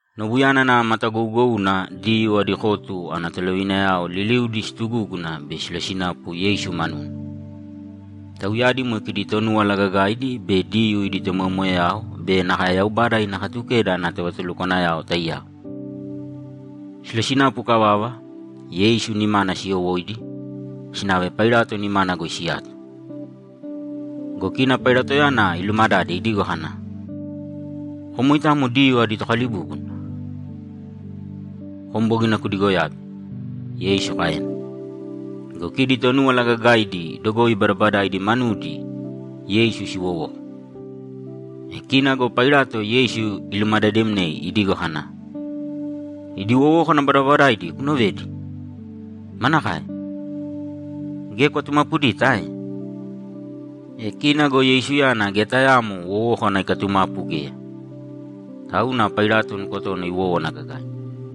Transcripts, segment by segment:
Nobuyana nava matagougouna Diyuu adi kotu ana tolovinayao liliudi situgúguna bei silosinapu Yeisu manuna. Tauyadi moe kidi Tonúwala Gagaidi be Diyuu idi tomoyamoyayao be nakae Yaubada ina Katukeda ana tovatulukwanayao taiyao. Silosinapu ikavava, Yeisu nimana siyowóidi, sinave Pailato nimana goi siyato. Go kina Pailatoyana ilumadade idigo kana, ‘Kom moitamo Diyuu adi Tokalibúbuna?’ ‘Kom bogina kudigoyabe.’ Yeisu kaena. Go kidi Tonúwala Gagaidi dogoi badabadaidi manudi Yeisu siwowoko. E kina go Pailato Yeisu ilumadademnei idigo kana, ‘Idi wowókana badabadaidi kuunovedi? Manakae? Geya kwatumapudita ae?’ E kina go Yeisuyana geya tayaamo wowókana ikatumapu geya, tauna Pailato nukotona iwówana gagaina.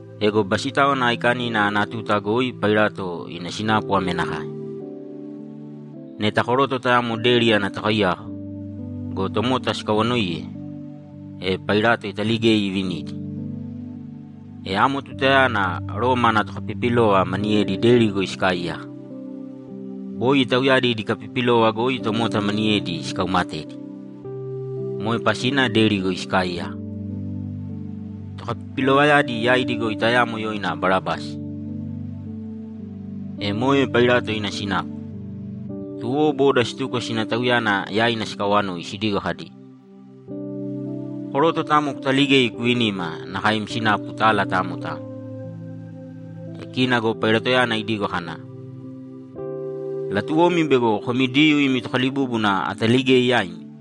Ego Basitáwana Aikanina ana tuta goi Pailato ina sinapu ame nakae: Neta koroto tayamo deri ana tokaiyaka go, tomota sikawanoiye, e Pailato italigei ivinidi. E amo tutayana Roma ana tokapipilova maniyedi deri goi sikaaiyaka. Boi tauyadi idi kapipilova goi tomota maniyedi sikaumatedi. Moe pasina deri goi sikaaiyaka. Tokapipilovayadi yaidi goi tayamo yoina Barabasi. E moe Pailato ina sinapu, tuwo boda situko sina tauyana yaina sikawanoi sidigo kadi, ‘Koroto tayamo kutaligēi kuvinīma nakae im sinapu tala tamo tamo.’ E kina go Pailatoyana idigo kana, ‘Latuwomi bego komi Diyuu imi Tokalibúbuna ataligei yaimi?’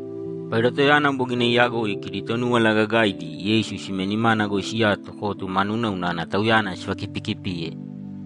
Pailatoyana bogina iyagoi kidi Tonúwala Gagaidi Yeisu sime nimana goi siyato kotu manuna unana Tauyana sivakipikipiye.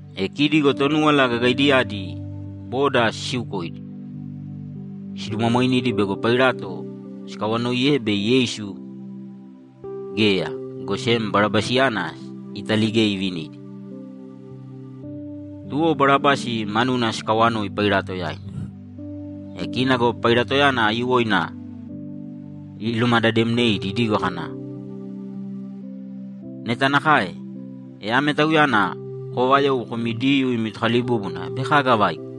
E kidi go Tonúwala Gagaidiyadi boda sisiukoidi, sidumwamwainidi bego Pailato sikawanoiye bei Yeisu geya, go sem Barabasiyana italigei ivinidi. Tuwo Barabasi manuna sikawanoi Pailato yaina. E kina go Pailatoyana aiyuwoina ilumadademneidi idigo kana, ‘Neta nakae, e ame Tauyana koovayou komi Diyuu imi Tokalibúbuna bei kaga avaiko?’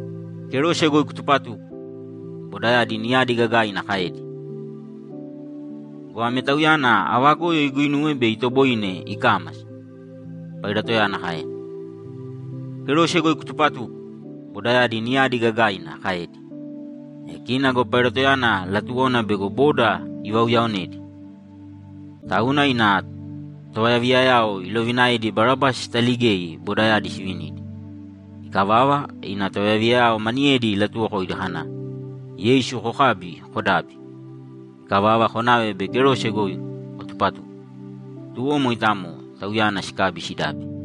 ‘Kerose goi kutupatūko!’ bodayadi niyadi gagaina kaedi. ‘Go ame Tauyana ava goyo iguinuwe bei itoboine ikámasa?’ Pailatoyana kaena. ‘Kerose goi kutupatūko!’ bodayadi niyadi gagaina kaedi. E kina go Pailatoyana latuwona bego boda ivauyaonedi, tauna ina tovayaviyayao ilovinaedi Barabasi sitaligei bodayadi sivinidi. Ikavava, ina tovayaviyayao maniyedi ilatuwokoidi kana, ‘Yeisu kokābi, kodābi. Ikavava konāve bei kerose goi kotupatūko.’ Tuwo moitamo Tauyana sikabi sidabi.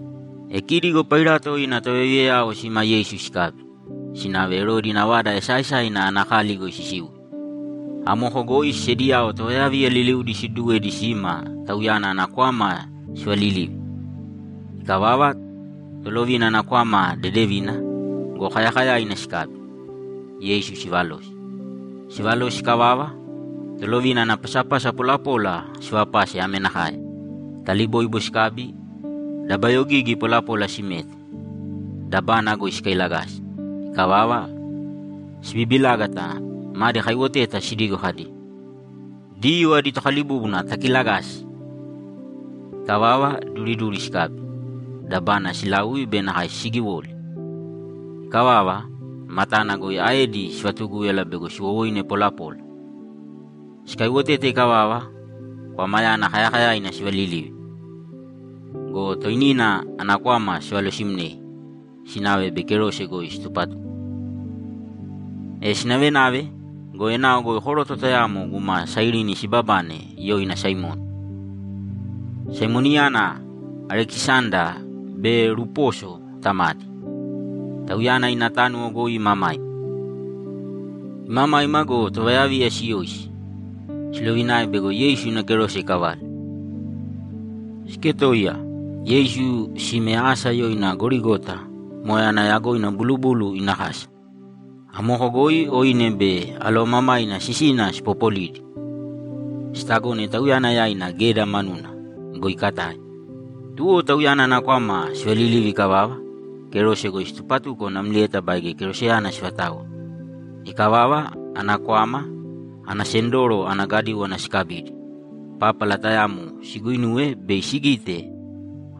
E kidi go Pailato ina tovayaviyayao sima Yeisu sikabi, sinave Erodi ina vada esaaesaina ana kali goi sisiuye. Amoko goi sediyao tovayaviya liliudi siduduwedi sima Tauyana ana kwama sivalilivi. Ikavava tolovina ana kwama dedevina go, kayakayaina sikabi, Yeisu sivalosi. Sivalosi ikavava, tolovina ana pasapasa polapola sivapase ame nakae: Taliboibo sikabi, dabayogigi polapola simete, dabana goi sikailagasi. Ikavava, sibibilágata madi kaiwoteta sidigo kadi, ‘Diyuu adi Tokalibúbuna takiilagāsi!’ Ikavava, duriduri sikabi, dabana silaui be nakae sigiwoli. Ikavava, matana goi aedi sivatugúyala bego siwowoine polapola. Sikaiwotete ikavava, kwamayana kayakayaina sivalilivi go, toinina ana kwama sivalosimnei, sinave bei kerose goi situpatuko. E sinavenave go, enao goi koroto tayamo guma Sairini sibabane yoina Saimoni. Saimoniyana Alekisanda be Rupuso tamadi. Tauyana ina tánuwo goi imamaima. Imamaima go, tovayaviya siyoisi, silovinae bego Yeisu ina kerose ikavale. Siketoiya, Yeisu sime asa yoina Gorigota (moe ana yagoina Bulubulu ina Kasa). Amoko goi oine be alovamamaina sisina sipopolidi, sitagone Tauyana yaina geda manuna go, ikatae. Tuwo Tauyana ana kwama sivalilivi ikavava, kerose goi situpatuko namlieta baige keroseyana sivataoe. Ikavava, ana kwama, ana sendoro, ana gadíwana sikabidi, pápala tayamo siguinuwe bei sigite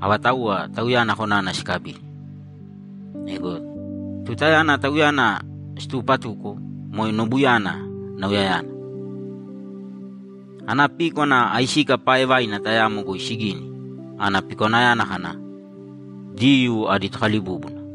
avatauwa Tauyana konana sikabidi. Ego tutayana Tauyana situupatuko moe nobuyana nauyayana. Ana píkwana aisika paaevaina tayamo goi sigini, ana pikwanayana kana, ‘Diyuu adi Tokalibúbuna.’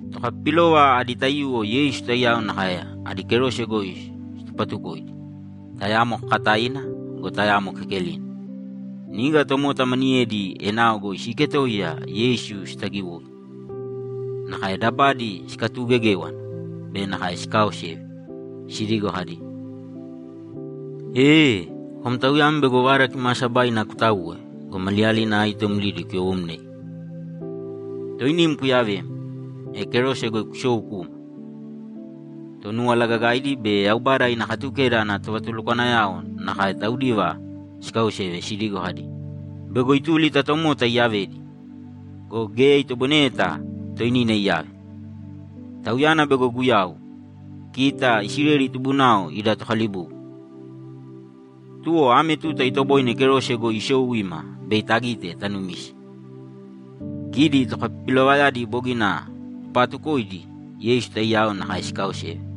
Tokapipilova adi taiyuwo Yeisu taiyao nakae adi kerose goi situpatukoidi, tayamo kakataina go, tayamo kekelina. Niga tomota maniyedi enao goi siiketoiya Yeisu sitagiwoi. Nakae dabadi sikatuugegéwana be nakae sikaaoseve sidigo kadi, ‘Ee kom tauyam bego Vada Kimaasabaina kutauwe go, maliyalina aito mlidi kuyowomnei, toinim kuyavēm, e kerose goi kusōu kūma!’ Tonúwala Gagaidi be Yaubada ina Katukeda ana tovatulukwanayao nakae taudiva sikaoseve sidigo kadi, ‘Bego ituli ta tomota iyavedi go, geya itoboineyeta toinina iyave. Tauyana bego Guyau, kita Isileli tubunao ida Tokalibúbuna, tuwo ame tuta itoboine kerose goi isou ima bei tagite tanumise.’ Kidi tokapipilovayadi bogina tupaatukoidi Yeisu taiyao nakae sikaaoseve.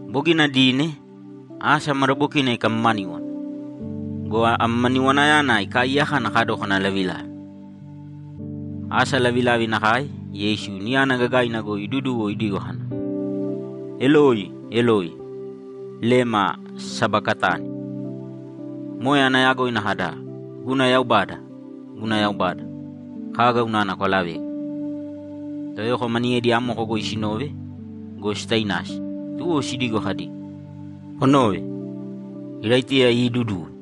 Bogina dine, asa madabokina ikamamaníwana go, amamaniwanayana ikaaiyaka ana kadókana lavilavi. Asa lavilavi nakae, Yeisu niyana gagaina goi iduduwo idigo kana, ‘Eloi, Eloi, lema sabakatani?’ Moe ana yagoina kada, ‘Guna Yaubada, guna Yaubada, kaga unana kwalavegu?’ Toyoko maniyedi amoko goi sinove go, sitainasi, tuwo sidigo kadi, ‘Konōve! Iraitiya iiduduwe.’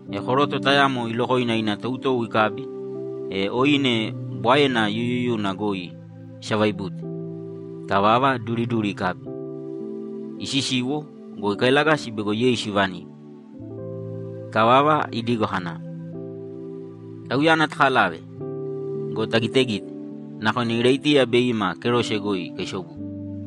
E koroto tayamo ilokoina ina toutou ikabi, e oine bwaena yuyuyuna goi isavaibute. Ikavava, duriduri ikabi, isisiwo go, ikailagasi bego Yeisu ivanim. Ikavava, idigo kana, ‘Tauyana takalāve go, tagitegīte. Nakona Iraitiya bei ima kerose goi ikaisobuye.’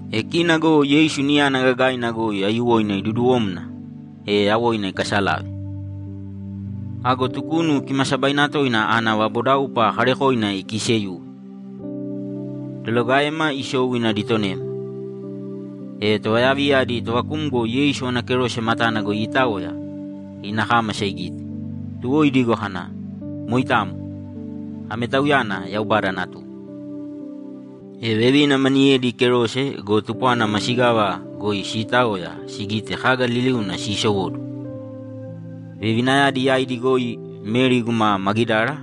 E kina go Yeisu niyana gagaina goi aiyuwoina iduduwomna, e yawoina ikasalave. Ago Tukunu Kimaasabaina Toina ana vabodaupa kaarekoina ikiiseyuwe, dolagaema isou ina ditonema. E tovayaviya adi tovakumgo Yeisu ana kerose matana goi iitaoya, ina kámasa igite, tuwo idigo kana, ‘Moitamo, ame Tauyana Yaubada Natuna.’ E vevina maniyedi kerose go, tupwana masigava goi siitaoya sigite kaga liliuna siisowóduwo. Vevinayadi yaidi goi Meri guma Magidara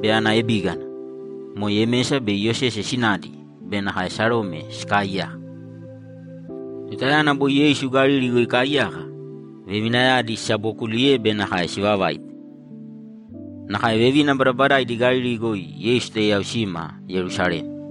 be ana ebígana, moe Yemesa be Iyosese sinadi be nakae Sarome sikaaiyaka. Tutayana boi Yeisu Galili goi ikaaiyaka, vevinayadi sisabookuliye be nakae sivavaite. Nakae vevina badabadaidi Galili goi Yeisu taiyao sima Yerusalema.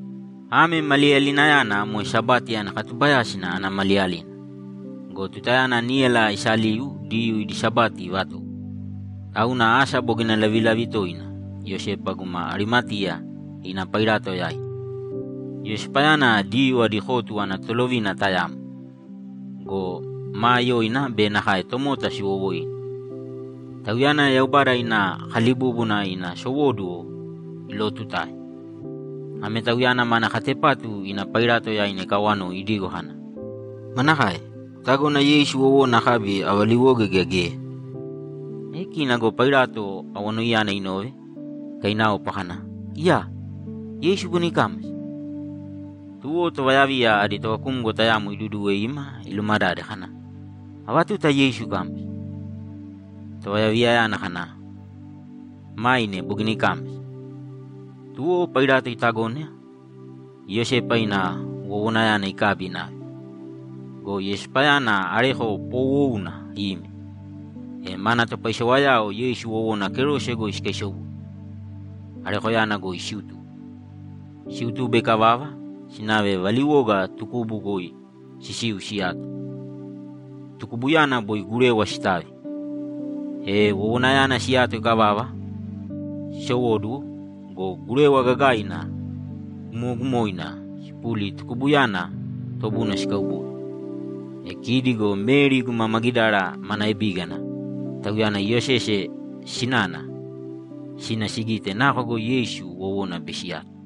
Ame maliyalinayana moe Sabati ana katubayásina ana maliyalina go, tutayana níyala isaliu Diyuu idi Sabati ivatowo, tauna asa bogina lavilavi toina Iyosepa guma Arimateya ina Pailato yaina. Iyosepayana Diyuu adi kotu ana tolovina tayamo go, maa yoina be nakae tomota siwowoine. Tauyana Yaubada ina kalibúbuna ina sowóduwo ilootutae. Ame tauyana mana katepatu ina Pailato yaina ikawanoi idigo kana, ‘Manakae? Kutagona Yeisu wowona akabi avaliwoge gea geya?’ E kina go Pailato awanoiyana inove, ikainaopa kana, ‘Iyaa! Yeisu bogina ikámasa?’ Tuwo tovayaviya adi tovakumgo tayamo iduduwe ima ilumadade kana, ‘Ava tuta Yeisu ikámasa?’ Tovayaviyayana kana, ‘Maine bogina ikámasa.’ Tuwo Pailato itagona Iyosepa ina wowonayana ikabi inave. Go Iyosepayana areko poowouna ime, e mana topaisewayao Yeisu wowona kerose goi sikaisobuye, arekoyana goi siutube. Siutube ikavava, sinave valiwoga tukubu goi sisiu siyato. Tukubuyana boi gurewa sitavi. E wowonayana siyato ikavava, sisowóduwo go, gurewa gagaina gumogumoina sipuli tukubuyana tobuna sikaubode. E kidi go Meri guma Magidara mana ebígana, tauyana Iyosese sinana, sina sigite nako goi Yeisu wowona bei siyato.